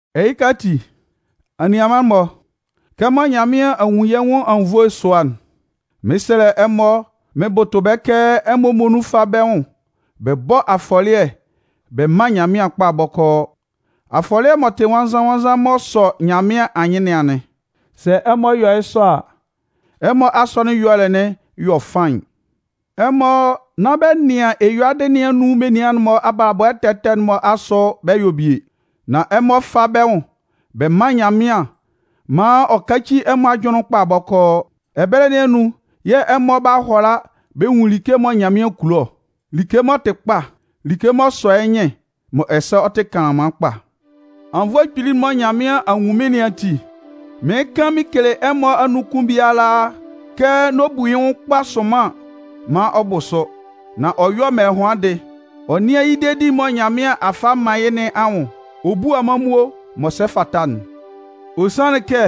Ɛhɩka ati, anianman-mɔ, kɛmɔ Nyanmɩan a nwun yɛ́ nwʋn anwunnvoe sʋa'n, mɩn 'sɛlɛ ɛmɔ mɩn bʋtʋ bɛ́ kɛ ɛmɔ muonun fá bɛ́ nwʋn bɛ bɔ́ afɔlɩɛ bɛ mán Nyanmɩan kpa bɔkɔɔ. Afɔlɩɛ m'ɔ tɩ nwannzan-nwannzan m'ɔ sɔ Nyanmɩan anyɩn nɩn anɩn. Sɛ ɛmɔ yɔ yɩ́ sɔ a, ɛmɔ asɔnɩn ɛyɔlɛ 'yɔ faɩn. Ɛmɔ nán bɛ nɩan eyuadɩ nɩn anun menian'n-mɔ abalabɔ ɛtɛ ɛtɛ'n-mɔ asʋ bɛ yɔ bie. Nan ɛmɔ fá bɛ́ nwʋn bɛ mán Nyanmɩan maan ɔ káci ɛmɔ ajʋnlɩn'n kpa bɔkɔɔ. Ɛbɛlɛ nɩn anun yɛ̂ ɛmɔ 'ba hʋala bɛ nwun like mɔ Nyanmɩan kulo ɔ, like m'ɔ tɩ kpa, like m'ɔ sɔ yɩ́ nyɩn, mɔ ɛsɛ ɔ tɩ kanlanman kpa. Anwunnvoe kpili'n mɔ Nyanmɩan a nwun mɩ́n nɩn ati, mɩɩn kan mɩn kele ɛmɔ anun kʋn biala kɛ n'ɔ bu yɩ́ nwʋn kpa sʋnman maan ɔ bʋ sʋ, nan ɔ yɔ́ mɛlɛhʋandɩ, ɔ nɩ́an yɩ́ dedi'n mɔ Nyanmɩan a fa a man yɩ́ nɩn anwʋn ɔ bú amanmuo m'ɔ sɛ fata'n. Ɔ sanlɩn kɛ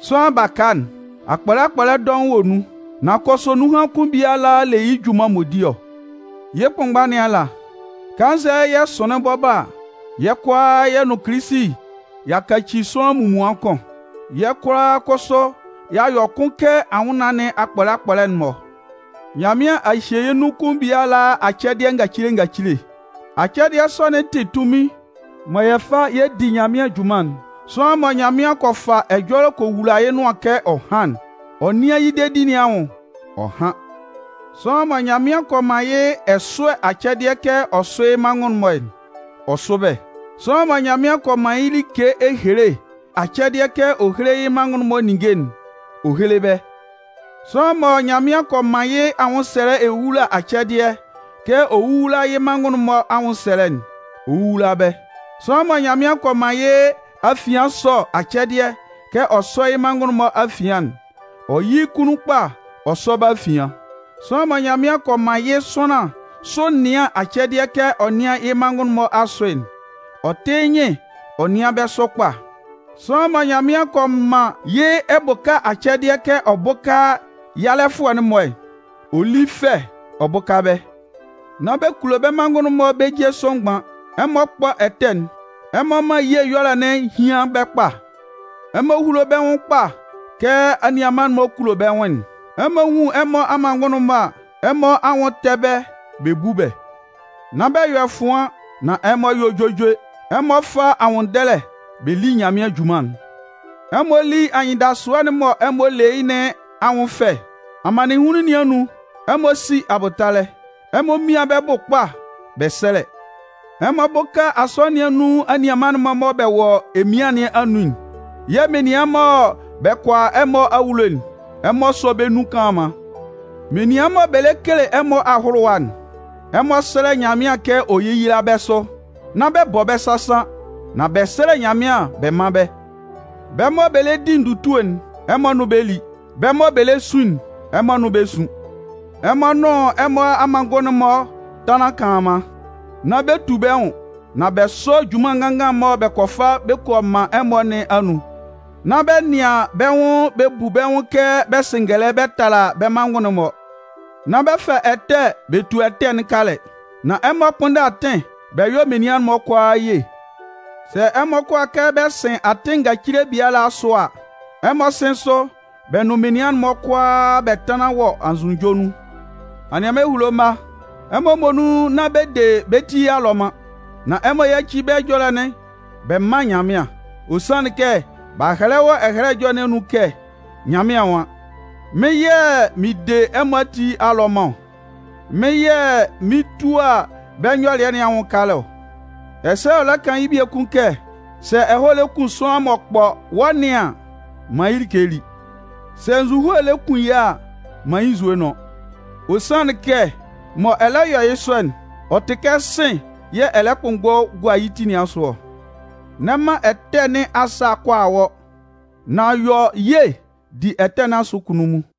sʋanlan baka'n, akpɔlɛ akpɔlɛ dɔʋn wɔ nun. Nan kʋsʋ, nunhan kʋn biala le yɩ́ junman m'ɔ di ɔ. Yɩ́ kʋnmgba nɩn ala, kannzɛ yɛ sʋnlɩn bɔbɔ a, yɛ́ kʋalaa yɛ nʋn Kilisi y'a kaci sʋanlan munmuan kʋn. Yɛ́ kʋalaa kʋsʋ y'a yɔ kʋn kɛ anwʋnnaan nɩn akpɔlɛ akpɔlɛ'n-mɔ. Nyanmɩan a hye yɛ́ nun kʋn biala acɛdɩɛ ngacile ngacile. Acɛdɩɛ sɔ'n tɩ tunmin mɔ yɛ fa yɛ di Nyanmɩan junman'n. Sʋanlan mɔ Nyanmɩan kɔ fa ɛjɔlɛ kɔ wula yɩ́ nʋan kɛ ɔ hán'n, ɔ nɩ́an yɩ́ dedi nɩn anwʋn ɔ hán. Sʋanlan mɔ Nyanmɩan kɔ man yɩ́ ɛsʋɛ acɛdɩɛ kɛ ɔ sʋ́ yɩ́ manngʋn'n-mɔ'n, ɔ sʋ́ bɛ́. Sʋanlan mɔ Nyanmɩan kɔ man yɩ́ like ehele acɛdɩɛ kɛ ɔ héhele yɩ́ manngʋn'n-mɔ ninnge'n, ɔ héhele bɛ́. Sʋanlan mɔ Nyanmɩan kɔ man yɩ́ anwʋnsɛlɛ ewowula acɛdɩɛ kɛ ɔ wówula yɩ́ manngʋn'n-mɔ anwʋnsɛlɛ'n, ɔ wówula bɛ́. Sʋanlan mɔ Nyanmɩan kɔ man yɩ́ afian ɛsɔ acɛdɩɛ kɛ ɔ sɔ́ yɩ́ manngʋn'n-mɔ afian'n, ɔ yɩ́ yɩ́ kunnun kpa ɔ sɔ́ bɛ́ afian. Sʋanlan mɔ Nyanmɩan kɔ man yɩ́ sʋanlan sʋ ɛnɩan acɛdɩɛ kɛ ɔ nɩ́an yɩ́ manngʋn'n-mɔ asʋ'n, ɔ tɩ́ yɩ́ nyɩn ɔ nɩ́an bɛ́ sʋ kpa. Sʋanlan mɔ Nyanmɩan kɔ man yɩ́ ɛbʋka acɛdɩɛ kɛ ɔ bʋ́ka yalɛfʋɛ'n-mɔ, ɔ lí fɛ ɔ bʋ́ka bɛ́. Nán bɛ kulo bɛ́ manngʋn'n-mɔ bɛ́ je sʋ mgban. Ɛmɔ kpɔ́ ɛtɛ'n. Ɛmɔ mán ye ɛyɔlɛ'n hían bɛ́ kpa. Ɛmɔ húlo bɛ́ nwʋn kpa kɛ anianman-mɔ kulo bɛ́ nwʋn'n. Ɛmɔ nwun ɛmɔ amanngʋn'n-mɔ a, ɛmɔ anwʋn tɛ́ bɛ́ bɛ bú bɛ́. Nán bɛ yɔ ɛfʋan, nan ɛmɔ yɔ́ juejue. Ɛmɔ fá anwʋnndɛlɛ bɛ lí yɛ̂ Mɩn junman'n. Ɛmɔ lí anyɩndasʋɛ'n mɔ ɛmɔ le yɩ́ nɩn anwʋn fɛ. Amannɩnhunlun nɩn anun, ɛmɔ sí abʋtalɛ. Ɛmɔ mían bɛ́ bʋ kpa bɛ sɛ́lɛ. Ɛmɔ bʋ́ka asɔnɩn nɩn anun anianman'n-mɔ mɔ bɛ wɔ emian nɩn anun'n. Yɛ̂ menian mɔ bɛ kɔ a ɛmɔ awulo'n, ɛmɔ sɔ́ bɛ́ nun kanlanman. Menian mɔ bɛ le kele ɛmɔ ahʋlʋwa'n, ɛmɔ sɛ́lɛ Nyanmɩan kɛ ɔ yéyila bɛ́ sʋ. Nán bɛ bɔ bɛ́ sasan, nan bɛ sɛ́lɛ Nyanmɩan bɛ mán bɛ́. Bɛ́ mɔ bɛ lɛ di ndutue'n, ɛmɔ nʋn bɛ́ lí. Bɛ́ mɔ bɛ lɛ sun'n, ɛmɔ nʋn bɛ́ sún. Ɛmɔ nʋn ɛmɔ amanngʋn'n-mɔ tánlan kanlanman. Nán bɛ tu bɛ́ nwʋn, nan bɛ sɔ́ junman nganngan mɔ bɛ kɔ fa bɛ kɔ man ɛmɔ nɩn anun. Nán bɛ nɩan bɛ́ nwʋn bɛ bu bɛ́ nwʋn kɛ bɛ sɩ ngɛlɛ bɛ tala bɛ́ manngʋn'n-mɔ. Nán bɛ fa ɛtɛ bɛ tua ɛtɛ'n kalɛ. Nan ɛmɔ kpʋ́nndɛ atɩn bɛ yɔ́ menian'n-mɔ kʋalaa ye. Sɛ ɛmɔ kʋala kɛ bɛ sɩn atɩn ngacile biala asʋ a, ɛmɔ sɩ́n sʋ bɛ nʋn menian'n-mɔ kʋalaa bɛ tánlan wɔ anzʋnunjɔ nun. Anianman ehulo mma, ɛmɔ muonun nán bɛ de bɛ́ ti alɔman. Nan ɛmɔ yáci bɛ́ ɛjɔlɛ'n bɛ mán Nyanmɩan. Ɔ sanlɩn kɛ b'a hɛlɛ wɔ Ɛhɛlɛ Ɛjɔlɛ nɩn anun kɛ Nyanmɩan nwan: Mɩ́n yɛ̂ mɩn de ɛmɔ ati alɔman ɔ. Mɩ́n yɛ̂ mɩn 'tua bɛ́ nyɔlɩɛ nɩn anwʋn kala ɔ. Ɛsɛ ɔ lɛ kan yɩ́ biekun kɛ: Sɛ ɛhɔɛ lɛ kun sʋanlan m'ɔ kpɔ wɔ́ nɩan an, man yɩ́ like lí. Sɛ nzuhoe lɛ kun yɩ́ a, man yɩ́ nzue nʋ́n. Ɔ sanlɩn kɛ mɔ ɛ lɛ yɔ yɩ́ sɔ'n, ɔ tɩ kɛ sɩ̂n yɛ̂ ɛ lɛ kpʋnmgbɔ gua yɩ́ ti nɩn asʋ ɔ. N'ɛ man ɛtɛ nɩn asa kʋala wɔ́, nan yɔ ye di ɛtɛ nɩn asʋ kunnunmun.